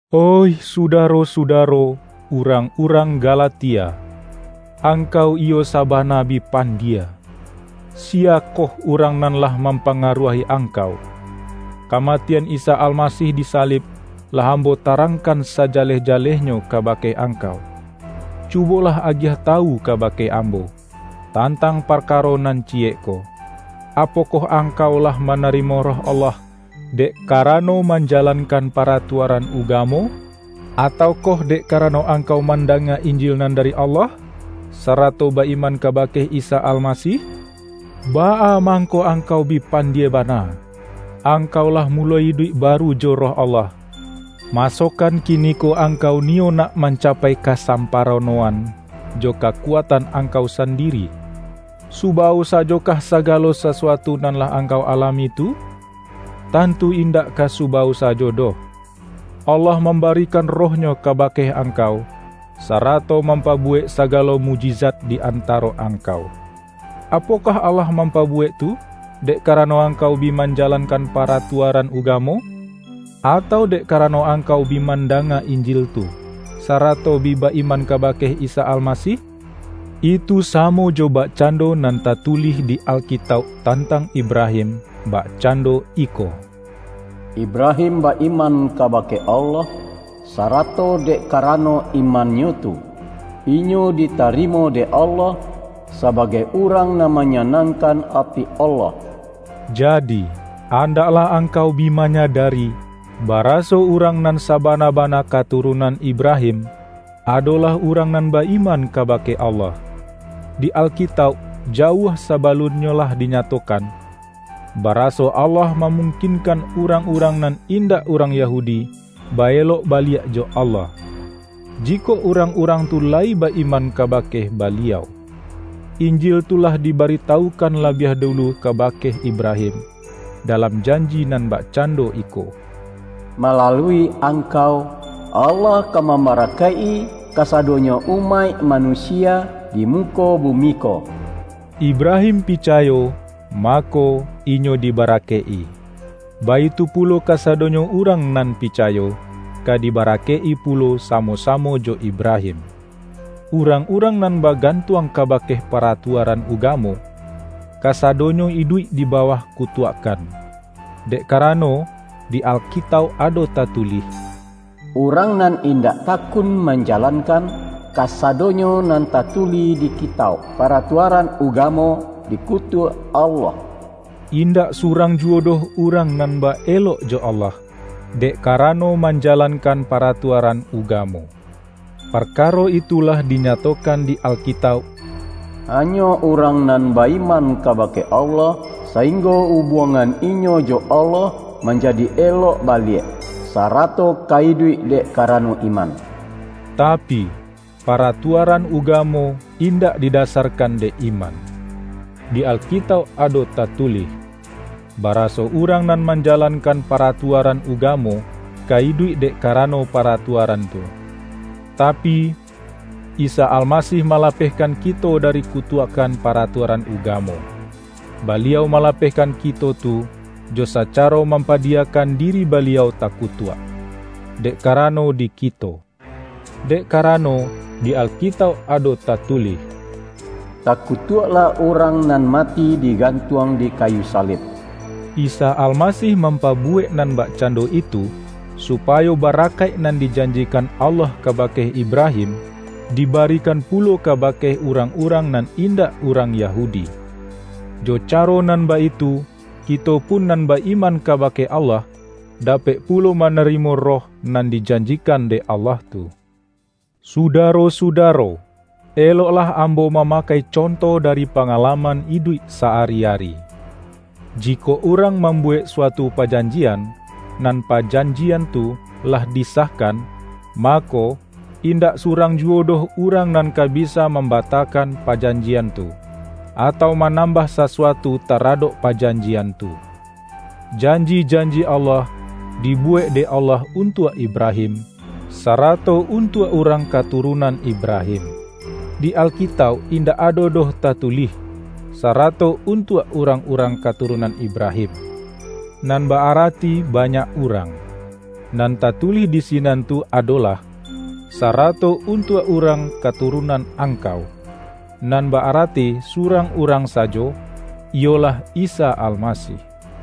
Oih sudaro-sudaro, urang-urang Galatia! Angkau iyo sabana bi pan-die! Siyakoh urang nan lah mampangaruahi angkau? Kamatian Isa Almasih disalib, lah ambo tarangkan sajaleh-ja-lehnyo kabake angkau! Cubolah agiah tawu kabake ambo, tantang parkaro nan ciyek ko: Apokoh angkau lah ma-narimo Roh Allah, dek karano manja-lankan paratuaran ugamo, atau koh dek karano angkau mandanga Injil nan dari Allah, sarato ba-iman kabake Isa Almasih? Baa mangko angkau bi pandie bana! Angkau lah muloi iduik baru jo Roh Allah, masokan kiniko angkau niyo nak mancapai kasampa-ronoan, jo kakuatan angkau sandiri? Subawo sajokoh sagalo sasuatu nan lah angkau alami tu? Tantu indak ka subawo sajo doh! Allah mambarikan Roh-Nyo kabake angkau, sarato mam-pabuwek sagalo mukjizat di antaro angkau. Apokoh Allah mampabuwek tu, dek karano angkau bi manjalankan paratuaran ugamo? Atau dek karano angkau bi mandanga Injil tu, sarato bi ba-iman kabake Isa Almasih? Itu samo jo bakcando nan tatulih di Alkitauk tantang Ibrahim — bak-cando iko,”Ibrahim ba-iman kabake Allah, sarato dek karano imannyo tu, inyo ditarimo dek Allah sabagai urang nan manyanangkan ati Allah.” Jadi, andaklah angkau bi manyadari, bara-so urang nan sabana-bana katurunan Ibrahim, adolah urang nan ba-iman kabake Allah. Di Alkitauk jauah sa-balunnyo lah dinyatokan, baraso Allah mamungkinkan urang-urang nan indak urang Yahudi, ba-elok baliak jo Allah, jikok urang-urang tu layi ba-iman ka-bake Baliau. Injil tu lah dibaritawu-kan labiah dulu kabake Ibrahim, da-lam janji nan bakcando iko,”Malalui angkau, Allah ka mambarakaik-i ka-sadonyo umaik manusia di muko bu-mi ko.” Ibrahim picayo, mako, inyo dibarakaik-i. Baitu pulo kasadonyo urang nan picayo, ka dibarakaik-i pu-lo samo-samo jo Ibrahim. Urang-urang nan bagantuang ka-bake paratuaran ugamo, kasadonyo iduik di bawah kutuakkan. Dek kara-no, di Alkitauk ado tatulih,”Urang nan indak takun manjalankan kasadonyo nan tatulih di Kitauk Paratuaran Uga-mo, dikutuak Allah!” Indak surang juwo doh urang nan ba-elok jo Allah, dek karano manjalankan paratuaran ugamo. Parkaro itu lah dinyatokan di Alkitauk,”Hanyo urang nan ba-iman kabake Allah, sainggo ubuangan inyo jo Allah manjadi elok baliak, sarato ka iduik dek karano iman!” Tapi, para-tuaran ugamo indak didasarkan dek iman. Di Alkitauk ado tatulih, bara-so urang nan manjalankan paratua-ran ugamo, ka iduik dek karano pa-ratuaran tu. Tapi, Isa Almasih malapehkan ki-to dari kutuakkan paratuaran ugamo. Baliau malapehkan kito tu, jo sacaro mampadiyakan diri Baliau takutuak, dek karano di kito. Dek karano, di Alkitauk ado tatulih,”Takutuaklah urang nan mati digantuang di kayu salib.” Isa Almasih mampabuwek nan bakcando itu, supayo barakaik nan dijanjikan Allah kabake Ibrahim, dibarikan pulo kabake urang-urang nan indak urang Yahudi. Jo caro nan baitu, kito pun nan ba-iman kabake Allah, dapek pulo manarimo Roh nan dijanjikan dek Allah tu. Sudaro-sudaro! Eloklah ambo ma-makai conto dari pangalaman iduik sa-ari-ari. Jikok urang mambuwek su-atu pajanjian, nan pajanjian tu lah di-sahkan, mako, indak surang juwo doh urang nan ka bisa mambatakan pajan-jian tu, atau manambah sasuatu tara-dok pajanjian tu. Janji-janji Allah, dibuwek dek Allah untuak Ibrahim, sarato untuak urang katurunan Ibrahim. Di Alkitauk indak ado doh tatu-lih,”sarato untuak urang-urang katu-runan Ibrahim”, nan ba-arati banyak urang. Nan tatulih di sinan tu adolah,”sarato untuak urang katurunan ang-kau”, nan ba-arati surang urang sajo, iyolah Isa Almasih.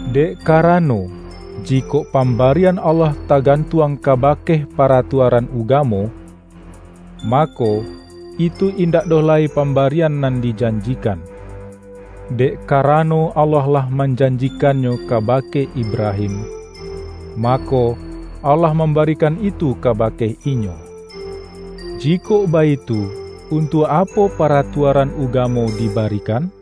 Dek karano, jikok pam-barian Allah tagantuang kabake pa-ratuaran ugamo, mako, itu indak doh lai pambarian nan dijanjikan. Dek ka-rano Allah lah manjanjikannyo kaba-ke Ibrahim, mako, Allah mambarikan itu kabake inyo. Jikok baitu, untuak apo paratua-ran ugamo dibarikan?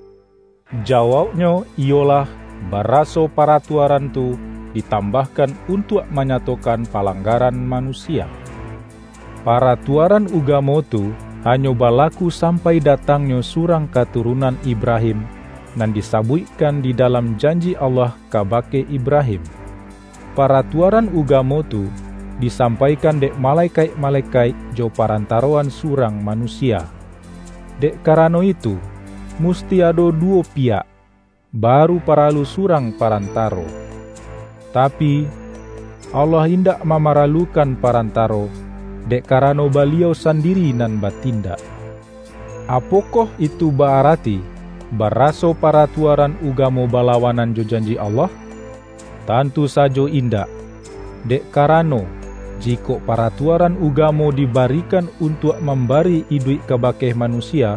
Jawauknyo iyo-lah, baraso paratuaran tu ditambah-kan untuak manyatokan palanggaran manusia. Paratuaran ugamo tu hanyo balaku sampai datangnyo surang ka-turunan Ibrahim, nan disabuikkan di dalam janji Allah kabake Ibrahim. Pa-ratuaran ugamo tu disampaikan dek malekaik-malekaik jo parantaroan su-rang manusia. Dek karano itu, mus-ti ado duwo piyak, baru paralu surang parantaro. Tapi, Allah indak mama-ralukan parantaro, dek karano Baliau sandiri nan batindak. Apokoh itu ba-arati, baraso pa-ratuaran ugamo balawanan jo janji Allah? Tantu sajo indak! Dek karano, jikok paratuaran ugamo dibarikan un-tuak mambari iduik kabake manusia,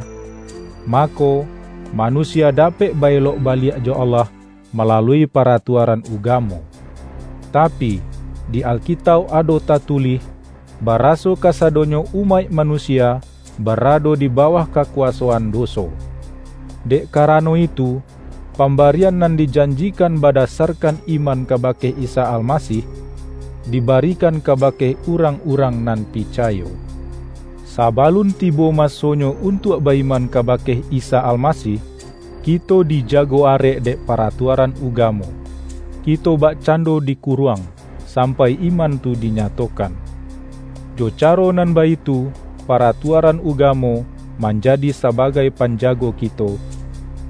mako, manusia dapek ba-elok baliak jo Allah malalui paratuaran ugamo. Tapi, di Alkitauk ado tatulih, baraso kasadonyo umaik manusia barado di bawah kakuwasoan doso. Dek kara-no itu, pambarian nan dijanjikan badasarkan iman kabake Isa Almasih, dibarikan kabake urang-urang nan picayo. Sabalun tibo masonyo untuak ba-iman kabake Isa Almasih, kito dija-go arek dek paratuaran ugamo; kito bakcando dikuruang, sampai iman tu dinyatokan. Jo caro nan baitu, paratuaran ugamo manjadi sabagai panjago kito,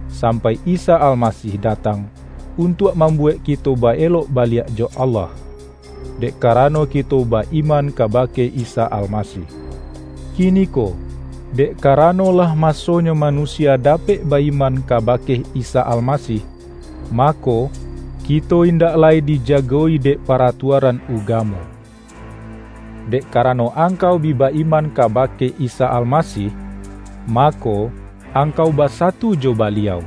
sampai Isa Almasih da-tang, untuak mambuwek kito ba-elok baliak jo Allah, dek karano kito ba-iman kabake Isa Almasih. Kiniko, dek karano lah masonyo manusia da-pek ba-iman kabake Isa Almasih, ma-ko, kito indak lai dijago-i dek para-tuaran ugamo. Dek karano angkau bi ba-iman ka-bake Isa Almasih, mako, angkau ba-satu jo Baliau;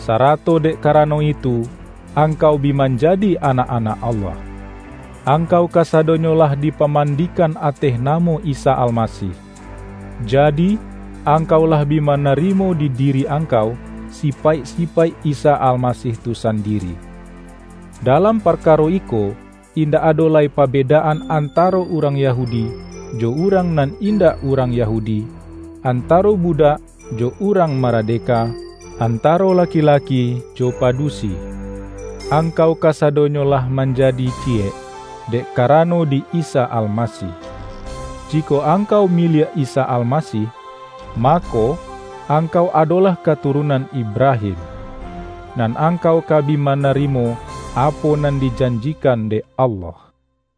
sarato dek karano itu, angkau bi manjadi anak-anak Allah. Angkau kasadonyo lah dipamandi-kan ateh namo Isa Almasih, jadi, ang-kau lah bi manarimo di diri angkau, sipaik-sipaik Isa Almasih tu sandiri. Dalam parkaro iko, indak ado lai pa-bedaan antaro urang Yahudi, jo urang nan indak urang Yahudi, antaro budak jo urang maradeka, antaro laki-laki jo padusi. Angkau kasadonyo lah manja-di ciyek, dek karano di Isa Almasih. Jikok angkau miliak Isa Almasih, mako, angkau adolah katurunan Ib-rahim. Nan angkau ka bi manarimo apo nan dijanjikan dek Allah.